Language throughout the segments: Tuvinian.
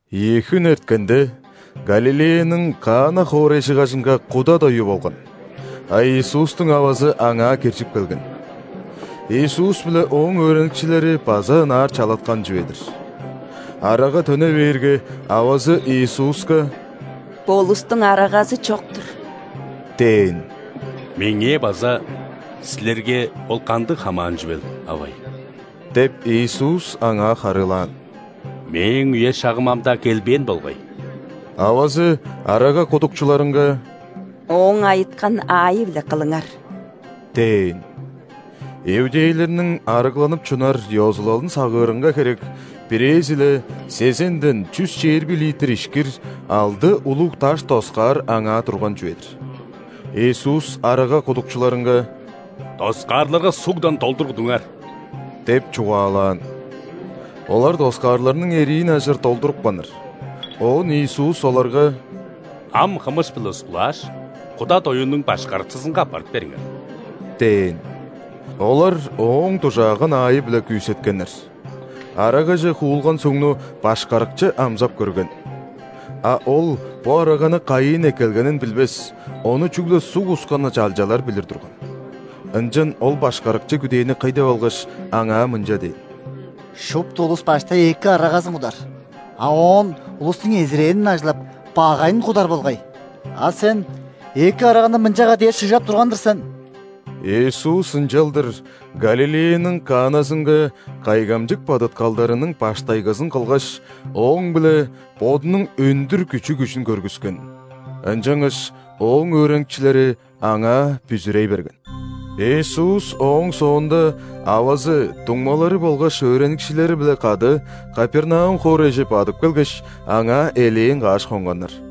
Ийи хүн эрткенде, Галилеяның Кана хоорайжыгажынга куда дою болган, а Иисустуң авазы аңаа киржип келген. Иисус биле Ооң өөреникчилери база ынаар чалаткан чүве-дир. Арага төне бээрге, авазы Иисуска: «Бо улустуң арагазы чок-тур» – дээн. «Меңээ база силерге ол кандыг хамаан чүвел, авай? – деп, Иисус аңаа харыылаан. – Мээң үе-шагым ам-даа келбээн болгай». Авазы арага кудукчуларынга: «Ооң айыткан аайы-биле кылыңар» – дээн. Иудейлерниң ·арыгланып чунар ёзулалын сагыырынга херек, бирээзи-ле сезенден чүс чээрби литр ишкир алды улуг даш доскаар аңаа турган чүве-дир. Иисус арага кудукчуларынга: «Доскаарларга сугдан долдур кудуңар» – деп чугаалаан. Олар доскаарларның эриин ажыр долдурупканнар. Оон Иисус оларга: «Ам хымыш-биле ускулааш, куда доюнуң башкарыкчызынга аппарып бериңер» – дээн. Олар Ооң дужааган аайы-биле күүсеткеннер. Арагаже хуулган сугну башкарыкчы амзап көрген. А ол бо араганы кайыын эккелгенин билбес, ону чүгле суг ускан чалчалар билир турган. Ынчан ол башкарыкчы күдээни кый деп алгаш, аңаа мынча дээн: «Шупту улус баштай эки арагазын кудар, а оон улустуң эзирээнин ажыглап, багайын кудар болгай. А сен эки араганы мынчага дээр шыгжап турган-дыр сен». Иисус ынчалдыр Галилеяның Каназынга кайгамчык бадыткалдарының баштайгызын кылгаш, ооң-биле Бодунуң өндүр күчү-күжүн көргүскен. Ынчангаш Ооң өөреникчилери Аңаа бүзүрей берген. Иисус ооң соонда авазы, дуңмалары болгаш өөреникчилери-биле кады Капернаум хоорайже бадып келгеш, аңаа элээн каш хонганнар.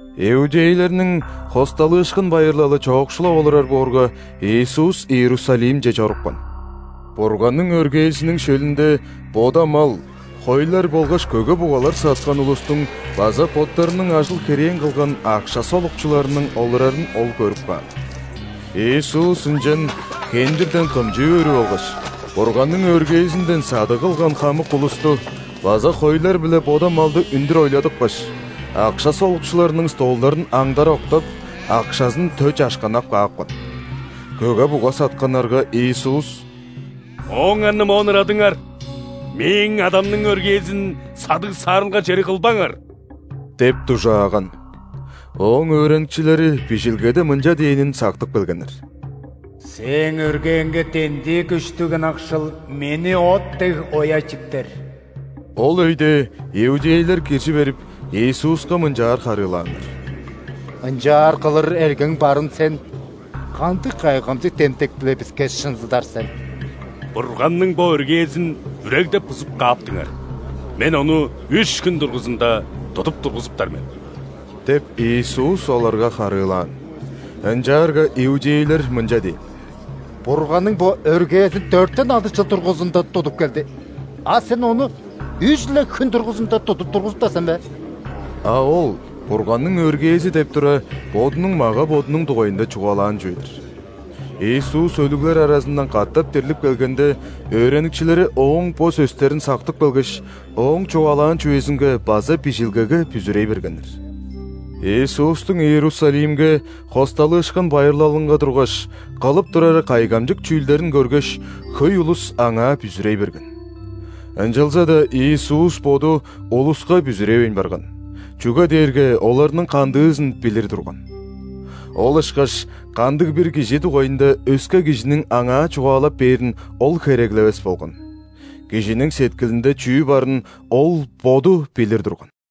Иудейлерниң ·Хосталыышкын байырлалы чоокшулап олурар боорга, Иисус Иерусалимче чорупкан. Бурганның өргээзиниң шөлүнде бода мал, хойлар болгаш көге-бугалар саткан улустуң база боттарының ажыл-херээн кылган акша солукчуларының олурарын Ол көрүп каан. Иисус ынчан хендирден кымчы өрүп алгаш, Бурганның өргээзинден садыг кылган хамык улусту база хойлар биле бода малды үндүр ойладыпкаш, акша солукчуларының столдарын аңдара октап, акшазын тө чашканнап каапкан. Көге-буга сатканнарга Иисус: «Ооңарны моон ырадыңар! Мээң Адамның өргээзин садыг-саарылга чери кылбаңар!» – деп дужааган. Ооң өөреникчилери Бижилгеде мынча дээнин сактып келгеннер: «Сээң өргээңге дендии күштүг ынакшыл Мени от дег оя чиптер». Ол өйде иудейлер киржи берип, Иисуска мынчаар харыылааннар: «Ынчаар кылыр эргең барын Сен кандыг кайгамчык демдек-биле биске шынзыдар сен?» «Бурганның бо өргээзин үрегдеп-бузуп кааптыңар, Мен ону үш хүн дургузунда тудуп тургузуптар мен» – деп, Иисус оларга харыылаан. Ынчаарга иудейлер мынча дээн: «Бурганның бо өргээзин дөртен алды чыл дургузунда тудуп келди, а Сен ону үш-ле хүн дургузунда тудуп тургузуптар сен бе?!» А Ол Бурганның өргээзи деп тура, Бодунуң мага-бодунуң дугайында чугаалаан чүве-дир. Иисус өлүглер аразындан катап дирлип келгенде, өөреникчилери Ооң бо сөстерин сактып келгеш, Ооң чугаалаан чүвезинге база Бижилгеге бүзүрей бергеннер. Иисустуң Иерусалимге ·Хосталыышкын байырлалынга тургаш, кылып турары кайгамчык чүүлдерин көргеш, хөй улус Аңаа бүзүрей берген. Ынчалза-даа Иисус Боду улуска бүзүревейн барган, чүге дээрге оларның кандыызын билир турган. Ол ышкаш кандыг-бир кижи дугайында өске кижиниң Аңаа чугаалап бээрин Ол хереглевес болган. Кижиниң сеткилинде чүү барын Ол Боду билир турган.